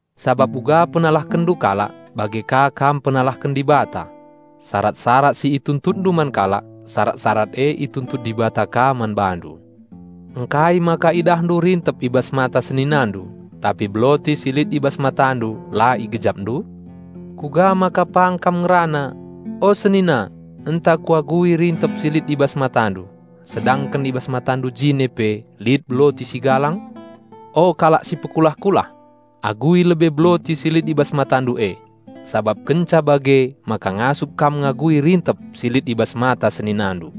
sabap uga penalahkenndu kalak bage ka kam penalahken Dibata. Sarat-sarat si ituntutndu man kalak, sarat-sarat e ituntut Dibata ka man bandu. Ngkai maka idahndu rintep i bas mata seninandu, tapi beloti si lit i bas matandu la igejapndu? Kuga maka pang kam ngerana, 'O senina, enta kuagui rintep si lit i bas matandu,' sedangken i bas matandu jine pe lit beloti si galang? O kalak si pekulah-kulah! Agui lebe beloti si lit i bas matandu e, sabap kenca bage maka ngasup kam ngagui rintep si lit i bas mata seninandu.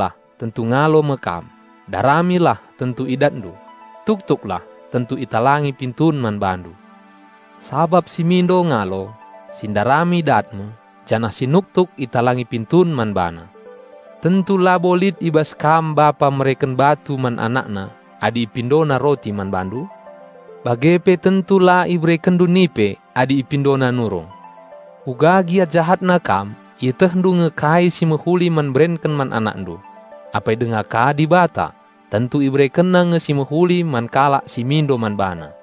"Pindolah, tentu ngalo me kam; daramilah, tentu idatndu; tuktuklah, tentu italangi pintun man bandu. Sabap si mindo, ngalo, si ndarami dat me, janah si nuktuk, italangi pintun man bana. Tentu labo lit i bas kam bapa mereken batu man anakna adi ipindona roti man bandu. Bage pe tentu la iberekenndu nipe adi ipindona nurung. Kuga gia jahatna kam ietehndu nge kai si mehuli man berenken man anakndu. Apai denga ka Dibata, tentu IberekenNa nge si mehuli man kalak si mindo man BaNa!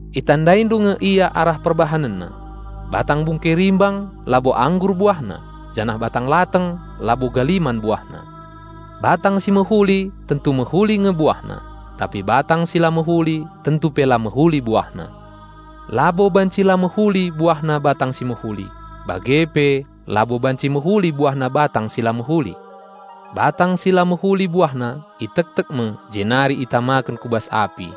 Itandaindu nge ia arah perbahanenna. Batang bungke rimbang labo anggur buahna, janah batang lateng labo galiman buahna. Batang si mehuli tentu mehuli nge buahna, tapi batang si la mehuli tentu pe la mehuli buahna. Labo banci la mehuli buahna batang si mehuli, bage pe labo banci mehuli buahna batang si la mehuli. Batang si la mehuli buahna itektek me jenari itamaken ku bas api.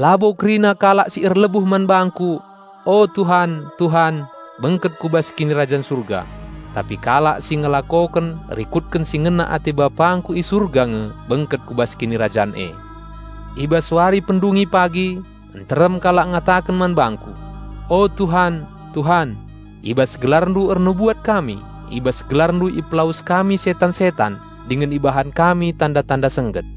"Labo kerina kalak si erlebuh man bangKu, 'O Tuhan, Tuhan!' bengket ku bas Kinirajan Surga, tapi kalak si ngelakoken rikutken si ngena ate bapangKu i Surga nge bengket ku bas Kinirajan e. I bas wari pendungi pagi, nterem kalak ngataken man bangKu, 'O Tuhan, Tuhan! I bas GelarNdu ernubuat kami, i bas GelarNdu ipelawes kami setan-setan dingen ibahan kami tanda-tanda sengget.'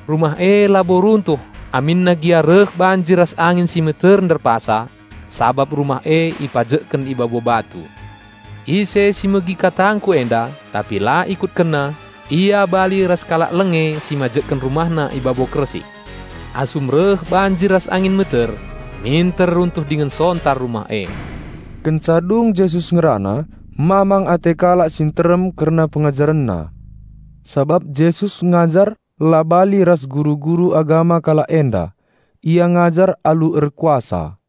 Rumah e labo runtuh aminna gia reh banjir ras angin si meter nderpasa, sabap rumah e ipajekken i babo batu. Ise si megi katangKu enda tapi la ikutkenna, ia bali ras kalak lenge si majekken rumahna i babo kersik. Asum reh banjir ras angin meter, minter runtuh dingen sontar rumah e." Kenca dung Jesus ngerana, mamang ate kalak si nterem kerna PengajarenNa. Sabap Jesus ngajar la bali ras guru-guru agama kalak enda; Ia ngajar alu erkuasa.